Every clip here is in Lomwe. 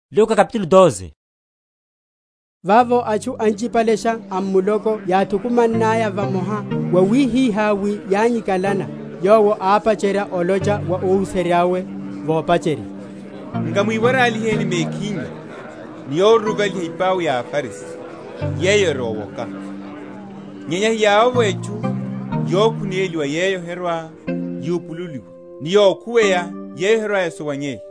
Sa owoka. Vavo atchu anchipalesha a muloko yáthukumannaya vamoha, wawihihá wi yányikalana, Yowo ápacherya olocha wa óhuserya’we, vopacherya, Nkamwiwaraliheni mekhinyu ni yoruruvaliha ipau ya aFarisi, yeyo eri owoka. Nyenya heyavovo etchu yokhuneliwa yeyo herwa‐yupululiwa; ni yokhuweya yeyo herwa‐esuwanyeya.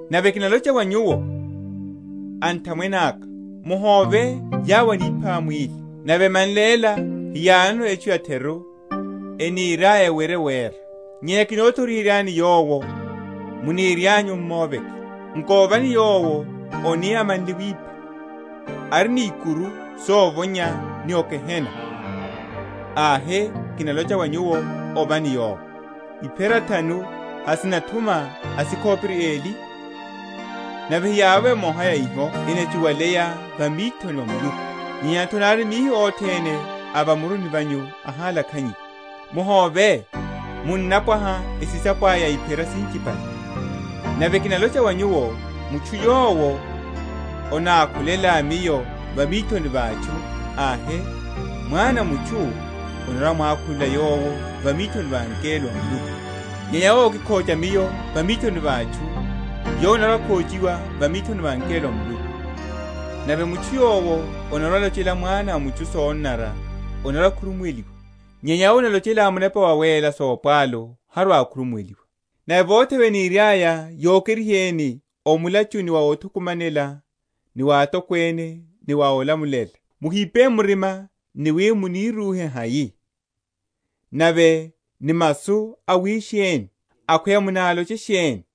Nave kinalocha wa nyuwo, anthamwene aka, Muhóve yawo enipha mwíli, nave emanle ela heyanono etchu ya’theru eniryaya ewerye wera. Nyenya kinothoriheryani yowo munirianyu m’moveke: nkovani Yowo ani amanle wipha ari ni ikuru sovonya ni o gehena, ahe, kinalocha wa nyuwo, ovani yowo. Iphera thanu hasinathuma asikhopiri eli? nave heyavovo emoha ya iho enachiwaleya va mithoni va Muluku; nyenya’tho nari mihi othene a va muruni vanyu ahalakhanyiwa. Muhóve, munnapwaha esisapo aya ya iphera sinchipale. Nave kinalocha wa nyuwo, Mutchu yowo anákhulela Miyo va mithoni va atchu, ahe, Mwana a mutchu anarwa‐amwákhulela yowo va mithoni va angelo a Muluku; nyenya yowo ókikhocha Miyo va mithoni va atchu, yowo anarwa‐akhochiwa va mithoni va angelo a Muluku. Nave mutchu yowo anarwa‐alochela Mwana a mutchu sonanara anarwa‐akhurumuweliwa; nyenya yowo analochela Munepa Wawéla sopwalu harwa‐akhurumuweliwa. Nave vothe vene eniryaya yokeriheni o mulachuni wa mothukumanela ni wa atokwene, ni wa ólamulela, muhipe murima ni wi munírúhe hai, nave ni masu awisheni, akhweya munaloche sheni;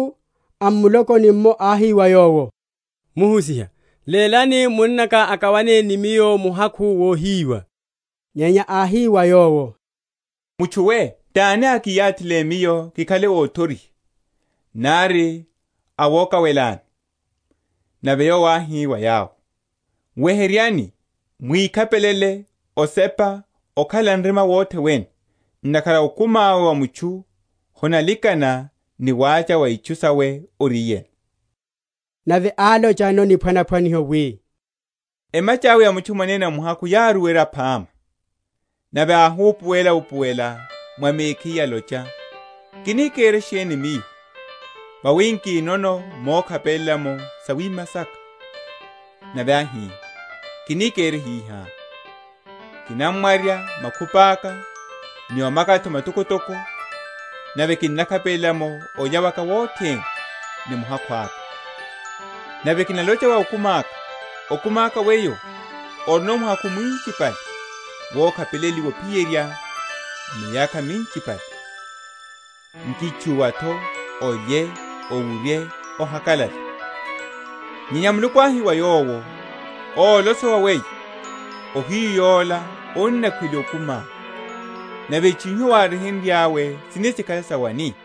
Nave mutchu a m’mulokoni’mmo áhi wa Yowo, Muhusiha, lélani munnaka akawane ni miyo muhakhu wohiyiwa. Nyenya áhi wa yowo, Mutchu we, tani ákiyathile Miyo kikhale óthoriha, nari awokawelani? Nave Yowo áhi wa yawo, Weheryani, mwikhapelele osepa okhalela nrima wothe wene; ntakhara okumi awe wa mutchu honalikana ni wacha wa itchu sawe oriyeno. Nave álochano niphwanaphwaniho, wi, Emacha’we ya mutchu mwanene muhakhu yáruwerya phama. Nave áhupuwela‐upuwela mwa mekhiye alocha, Kini kere sheni miyo, vawi nkinono mokhapelela’mo sawima saka? Nave áhi, Kini kere hiha: Kinamwarya makhupi aka, ni omaka’tho matokotoko, nave kinakhapelela’mo olya waka wothene, ni muhakhu aka. Nave kinalocha wa okumi aka, Okumi weyo, orino muhakhu mwinchipale wokhapeleliwa ophiyerya miyakha minchipale, nkítchúwa’tho, olye, owurye, ohakalale. Nyenya Muluku áhi wa yowo, Ólosowa weyo, ohiyu yola onakhweliwa okumiá; nave itchu iho wáryehenryá sini sikhale sa wani?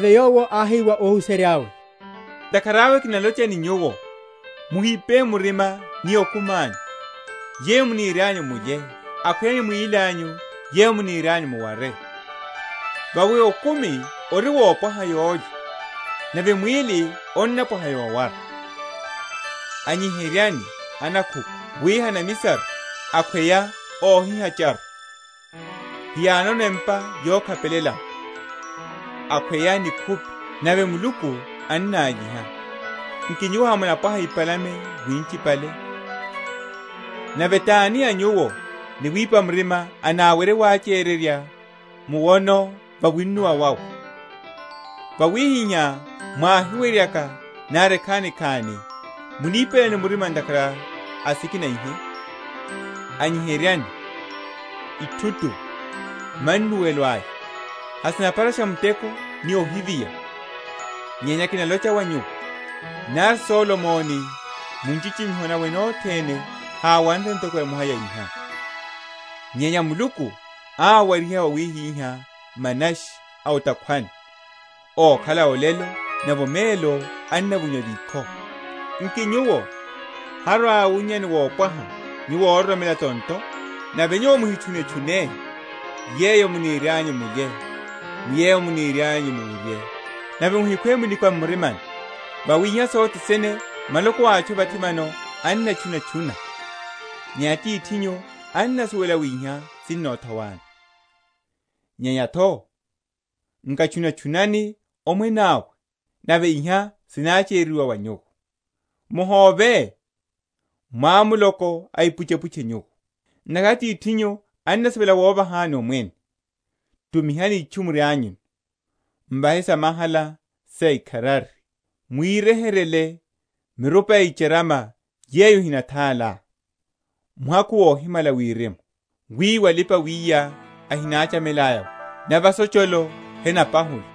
Nave Yowo áhi wa óhuserya’we, Ntakhara awe kinalocha ni nyuwo, muhipe murima ni okumi anyu, yeyo munirianyu mulye; akhweya ni mwíli anyu, yeyo munirianyu muware. Vawi okumi ori wopwaha yólya, nave mwíli onnapwaha yowara. Anyiheryani anakhuku, wi henamisaru, akhweya ohihacharu; hiyanono empa yokhapelela’mo; akhweya nikhupi; nave Muluku annályiha: nki nyuwo hamunapwaha ipalame winchipale! Nave tani a nyuwo, ni wipa murima anáwerye wachererya muwono va wunnuwa wawe? Wawihihá mwáhiweryaka nari ekhanikhani, munipelani murima ntakhara a sikina ihe? Anyiheryani ithutu, mannuwelo aya: hasinapharasha muteko ni ohiviya; nyenya kinalocha wa nyuwo, Nari Solomoni mu nchichimiho nawe nothene háwanre ntoko emoha ya iha. Nyenya Muluku awariha wawihiha manashi a o’takhwani ókhala olelo, nave omelo ennavonyiwa vikho; nki nyuwo harwa‐awunnyani wopwaha, nyuwo óroromela tonto? Nave nyuwo muhitchunetchune yeyo munirianyu mulye, ni yeyo munirianyu muwurye; nave muhikhwe minikwa m’murimani. Vawi iha sothe sene maloko a atchu a vathi vano ennatchunatchuna; nyenya Atithinyu annasuwela wi iha sinnothowani. Nyenya’tho nkatchunatchunani Omwene awe, nave iha sinachereryiwa wa nyuwo. Muhóve, mwamuloko a ipuchepuche nyuwo; ntakhara Atithinyu annasivela wovahani Omwene. Tumihani itchu murianyuno, m’vahe samahala saikharari; mwiryeheryele mirupa ya icharama yeyo ehinathála, muhakhu wohimala wirimu, wiwo alipa‐wiya ehináchamelaya’wo, nave asocholo henapahula.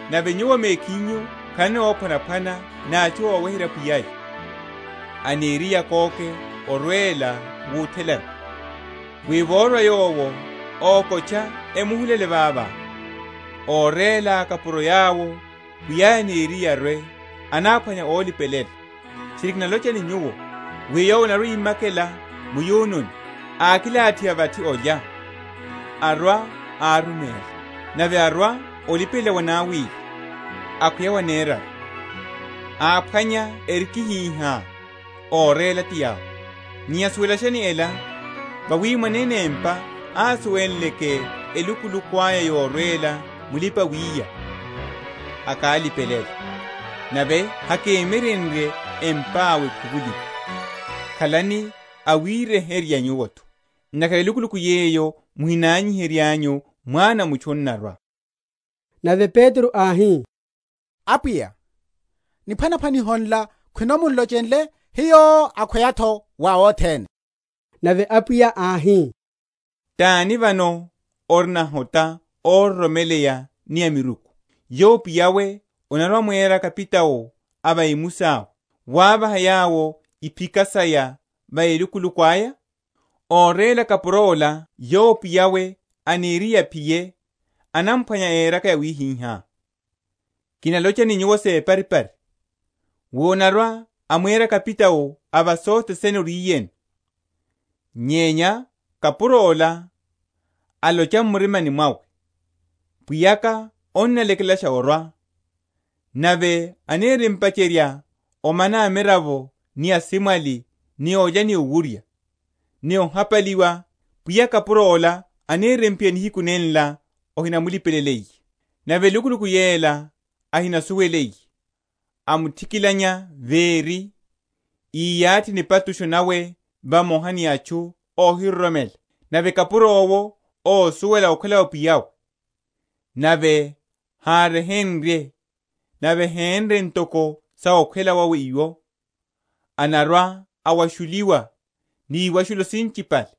nave nyuwo mekhinyu khalani óphwanaphwana ni atchu óweherya pwiya’ya, aniriye akóke orwela wuthelani; wi vorwa yowo, okotcha, emuhulele vavo. Óréla akapuro yawo, pwiya’ya aniriye arwe, anáphwanya ólipelela; tchiri kinalocha ni nyuwo, wi yowo anarwa‐imakela mu’yununi, ákilathiha vathi olya, arwa, áruméla. Nave arwa olipelela wanawili, akhweya waneraru, áphwanya erikihihá, óréla ti yawo. Nyenya suwelashani ela, wi mwanene empa ásuwenleke elukuluku aya yorwela mulipa‐wiya, akálipelela, nave hakémyerenrye empa’we ekhuvuliwe. Khalani awiryeherya nyuwo’tho: ntakhara elukuluku yeyo muhinanyiheryanyu, Mwana a mutchu anarwa. Nave Petro áhi, Apwiya, niphwanaphwaniho nla khwino mun’lochenle hiyo, akhweya’tho wa othene? Nave Apwiya áhi, Tani vano ori nahota óroromeleya ni amiruku, yowo pwiya’we anarwa‐amwera kapitao a va emusi awe, wávaha yawo iphika saya va elukuluku aya? Óréla kapuro ola yowo pwiya’we aniriye aphiye, anamphwanya éraka yawihihá. Kinalocha ni nyuwo separipari, wi anarwa‐amwera kapitao a va sothe sene oriyeno. Nyenya kapuro’la alocha m’murimani mwawe, Pwiyaka annalekelasha orwa; nave anirimpacherya omana amiravo ni asimwali ni olya ni owurya, ni ohapaliwa; pwiya a kapuro’wo anirimphiya nihiku nenla ahinamulipeleliye, nave elukuluku yela ahinasuweliye, amuthikilanya véri, íyathi nipatusho nawe vamoha ni atchu óhiroromela. Nave kapuro’wo, ósuwela okhwela wa pwiya’we, nave háryehenrye, nave hénre ntoko sa okhwela wawe iwo, anarwa‐awashuliwa ni iwashushu sinchipale.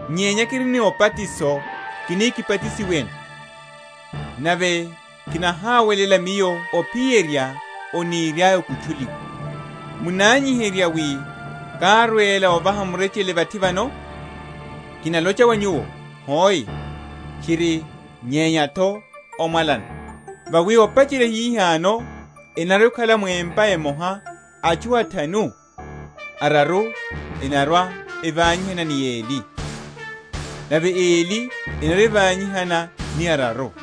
Nyenya kiri ni obatiso kini kibatisiweno; nave kinahawelela Miyo ophiyerya oniriaya okutchuliwe! Munanyiherya wi kárwela ovaha murechele vathi vano? Kinalocha wa nyuwo, Hoe, tchiri, nyenya’tho omwalana; vawi opacherya hihano enarwa‐ekhala mu empa emoha atchu athanu, araru enarwa‐evanyihana ni eli, nave eli enarwa‐evanyihana ni araru.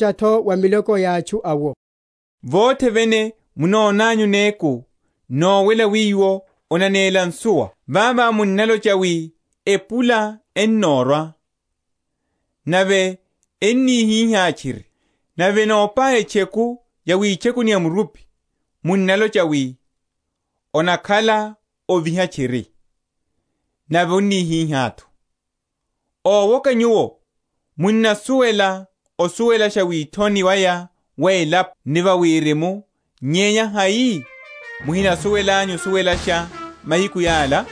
Nyenya Yowo álocha’tho wa miloko ya atchu awo, Vothe vene munonanyu néku nowela wiwo onanéla nsuwa, vavo munnalocha, wi, Epula ennórwa; nave ennihihá tchiri. Nave enopaya etcheku ya witchekuni ya murupi, munnalocha, wi, Onakhala oviha tchiri; nave onnihihá’tho. Ówoka nyuwo, munnasuwela osuwelasha withoni waya wa elapo ni wa wirimu; nyenya hai muhinasuwelanyu osuwelasha mahiku yala?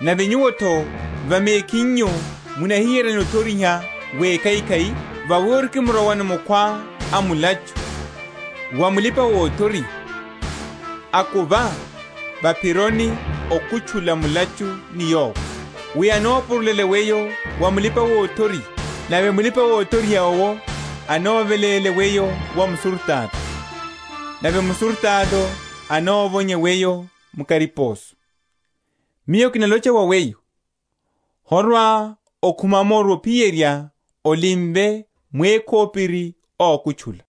Nave nyuwo’tho, va mekhinyu munahiyeryani othoriha wekhaikhai? Vawi orikimrowano mukhwá a mulachu, wa mulipa‐othoriha, akuva va’phironi okutchula mulachu ni yowo, wi anopurulele weyo wa mulipa‐othoriha, nave mulipa‐othoriha owo anáveléle weyo wa musurutato, nave musurutato anovonye weyo mu kariposo. Miyo kinalocha wa weyo, Horwa‐okhuma’moru ophiyerya olimve mwékhopiri ókutchula.